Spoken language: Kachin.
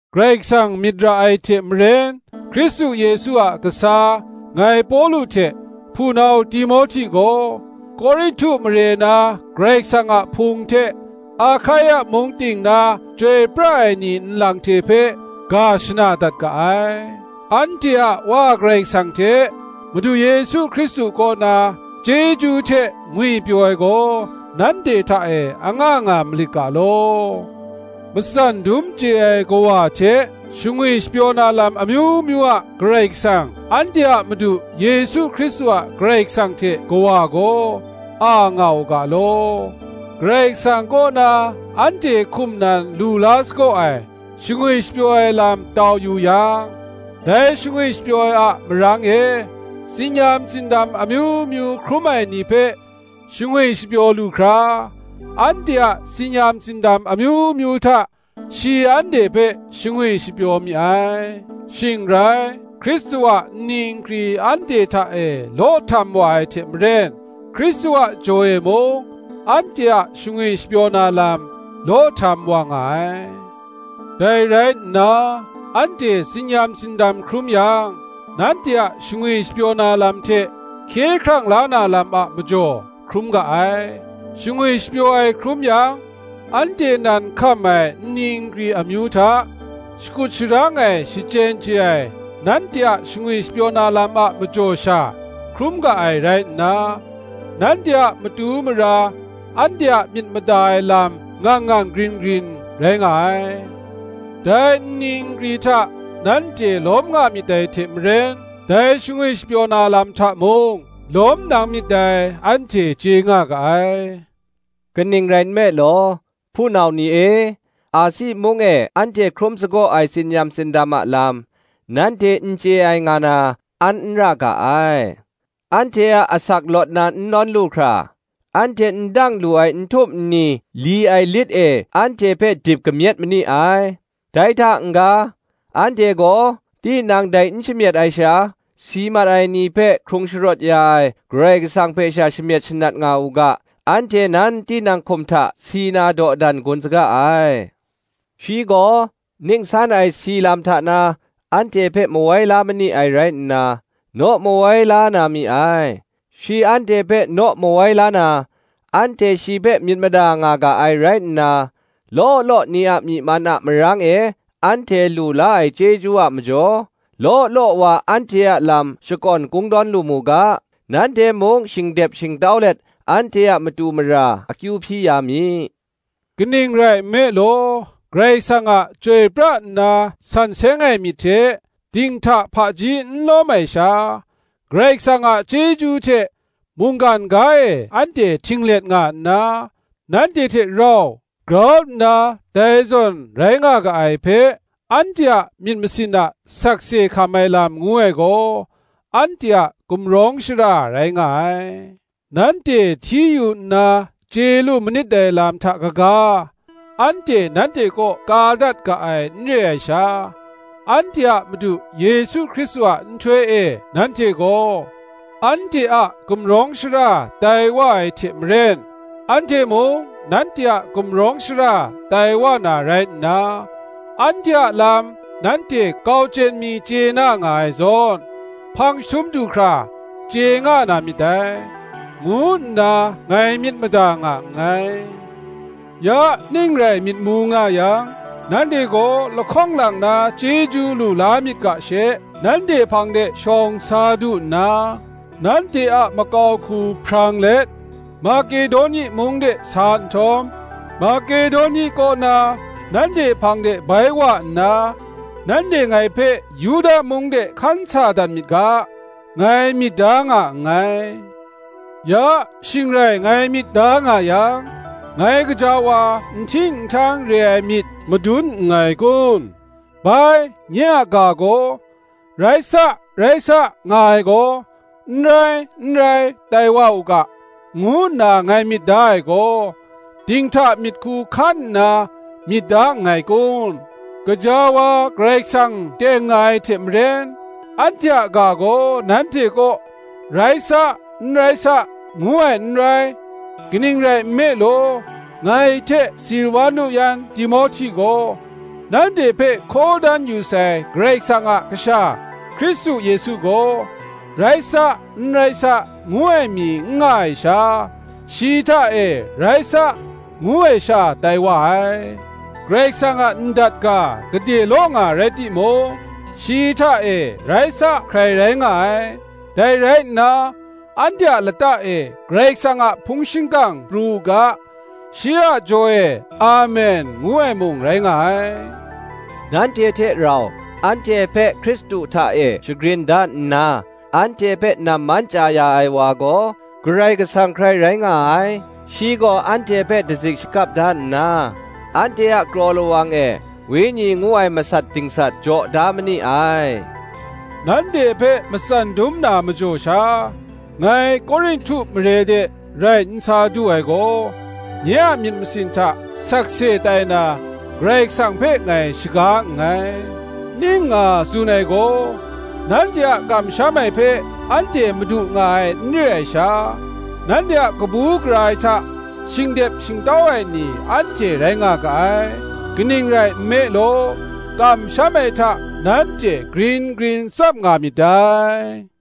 Karai Kasang myit ra ai hte maren, Hkristu Yesu a kasa, ngai Pawlu hte, hpunau Timohti gaw, Korinhtu mare na Karai Kasang a Hpung hte Ahkaia mung ting na chyoi pra ai ni nlang hte hpe, ga shana dat ga ai. Anhte a Wa Karai Kasang hte Madu Yesu Hkristu kaw na, chyeju hte ngwipyaw ai gaw, nanhte hta e anga nga malit ga law. Matsan dum chye ai Kawa hte, shangwi shapyaw na lam amyu myu a Karai Kasang, anhte a Madu Yesu Hkristu a Karai Kasang hte Kawa gaw, a nga u ga law. Karai Kasang kaw na anhte hkum nan lu la sagaw ai shangwi shapyaw ai lam tau yu yang, dai shangwi shapyaw ai a marang e, tsin-yam tsindam amyu myu hkrum ai ni hpe shangwi shapyaw lu hkra, anhte a tsin-yam tsindam amyu myu hta shi anhte hpe shangwi shapyaw mi ai. Shing rai, Hkristu a nni nkri anhte hta e law htam wa ai hte maren, Hkristu a jaw e mung, anhte a shangwi shapyaw na lam, law htam wa nga ai. Dai rai nna, anhte tsin-yam tsindam hkrum yang, nanhte a shangwi shapyaw na lam hte hkye hkrang la na lam a majaw, hkrum ga ai: shangwi shapyaw ai hkrum yang, anhte nan hkam ai nni nkri amyu hta, shakut sharang ai shachyen chye ai nanhte a shangwi shapyaw na lam a majaw sha hkrum ga ai rai nna, nanhte a matu mara anhte a myit mada ai lam ngang ngang grin grin rai nga ai: dai nni nkri hta nanhte lawm nga myit dai hte maren, dai shangwi shapyaw na lam hta mung lawm nang myit dai, anhte chye nga ga ai. Kaning rai nme law, hpunau ni e, Asi mung e anhte hkrum sagaw ai tsin-yam tsindam a lam, nanhte n chye ai nga na, an n ra ga ai; anhte a asak lawt na n nawn lu hkra, anhte n dang lu ai nhtum nni li ai lit e anhte hpe dip kamyet ma ni ai: dai hta n-ga, anhte gaw tinang dai n shamyet ai sha, si mat ai ni hpe hkrung sharawt ya ai Karai Kasang hpe sha shamyet shanat nga u ga, anhte nan tinang hkum hta si na dawdan gun saga ai. Shi gaw ning san ai si lam hta na anhte hpe mawai la ma ni ai rai nna, naw mawai la na mi ai; shi anhte hpe naw mawai la na, anhte shi hpe myit mada nga ga ai rai nna, law law ni a myi man a marang e anhte lu la ai chyeju a majaw, law law wa anhte a lam shakawn kungdawn lu mu ga, nanhte mung shingdep shingtau let anhte a matu mara akyu hpyi ya mi. Kaning rai nme law, Karai Kasang a chyoi pra nna san seng ai myit hte, dinghta hpaji n lawm ai sha, Karai Kasang a chyeju hte, mungkan ga e anhte htinglet nga nna, nanhte hte rau grau nna dai zawn rai nga ga ai hpe, anhte a myit masin a sakse hkam ai lam ngu ai gaw, anhte a gumrawng shara rai nga ai. Nanhte hti yu nna chye lu manit dai lam hta kaga, anhte nanhte kaw ka dat ga ai n re ai sha, anhte a Madu Yesu Hkristu a nhtoi e nanhte gaw, anhte a gumrawng shara tai wa ai hte maren, anhte mung nanhte a gumrawng shara tai wa na rai nna, anhte a lam nanhte kau chyen mi chye na nga ai zawn, hpang chyahtum du hkra chye nga na myit dai, ngu nna ngai myit mada nga nngai. Ya, ning rai myit mu nga yang, nanhte gaw lahkawng lang na chyeju lu la myit ga she, nanhte hpang de shawng sa du nna, nanhte a makau hku hprang let Makedoni mung de sa nhtawm, Makedoni kaw na nanhte hpang de bai wa nna, nanhte ngai hpe Yuda mung de hkan sa dat mi ga, ngai myit da nga nngai. Ya, shing rai ngai myit da nga yang, ngai gaja wa nhting nhtang re ai myit madun nngai kun? Bai, nye a ga gaw, Rai sa, rai sa, nga ai gaw, N rai, n rai, tai wa u ga, ngu nna ngai myit da ai gaw, dinghta myit hku hkan nna myit da nngai kun? Gaja wa, Karai Kasang teng nga ai hte maren, anhte a ga gaw nanhte kaw, Rai sa, n rai sa, ngu ai n rai. Kaning rai nme law, ngai hte Silwanu yan Timohti gaw, nanhte hpe hkaw dan yu sai Karai Kasang a Kasha Hkristu Yesu gaw, Rai sa, n rai sa, ngu ai mi n nga ai sha, shi hta e, Rai sa, ngu ai sha tai wa ai. Karai Kasang a ndat ga gade law nga rai timung, shi hta e, Rai sa, hkrai rai nga ai; dai rai nna, anhte a lata e Karai Kasang a hpung shingkang pru u ga, shi a jaw e, Amen, ngu ai mung rai nga ai. Nanhte hte rau anhte hpe Hkristu hta e shagrin da nna, anhte hpe namman chya ya ai wa gaw, Karai Kasang hkrai rai nga ai: shi gaw anhte hpe dazik shakap da nna, anhte a kraw lawang e Wenyi ngu ai masat dingsat jaw da ma ni ai. Nanhte hpe matsam dum na majaw sha, ngai Korinhtu mare de rai n sa du ai gaw, nye a myit masin hta sakse tai na, Karai Kasang hpe ngai shaga nngai. Ning nga tsun ai gaw, nanhte a kamsham ai hpe anhte madu nga ai n re ai sha, nanhte a kabu gara ai hta shingdep shingtau ai ni anhte rai nga ga ai; kaning rai nme law, kamsham ai hta nanhte grin grin tsap nga myit dai.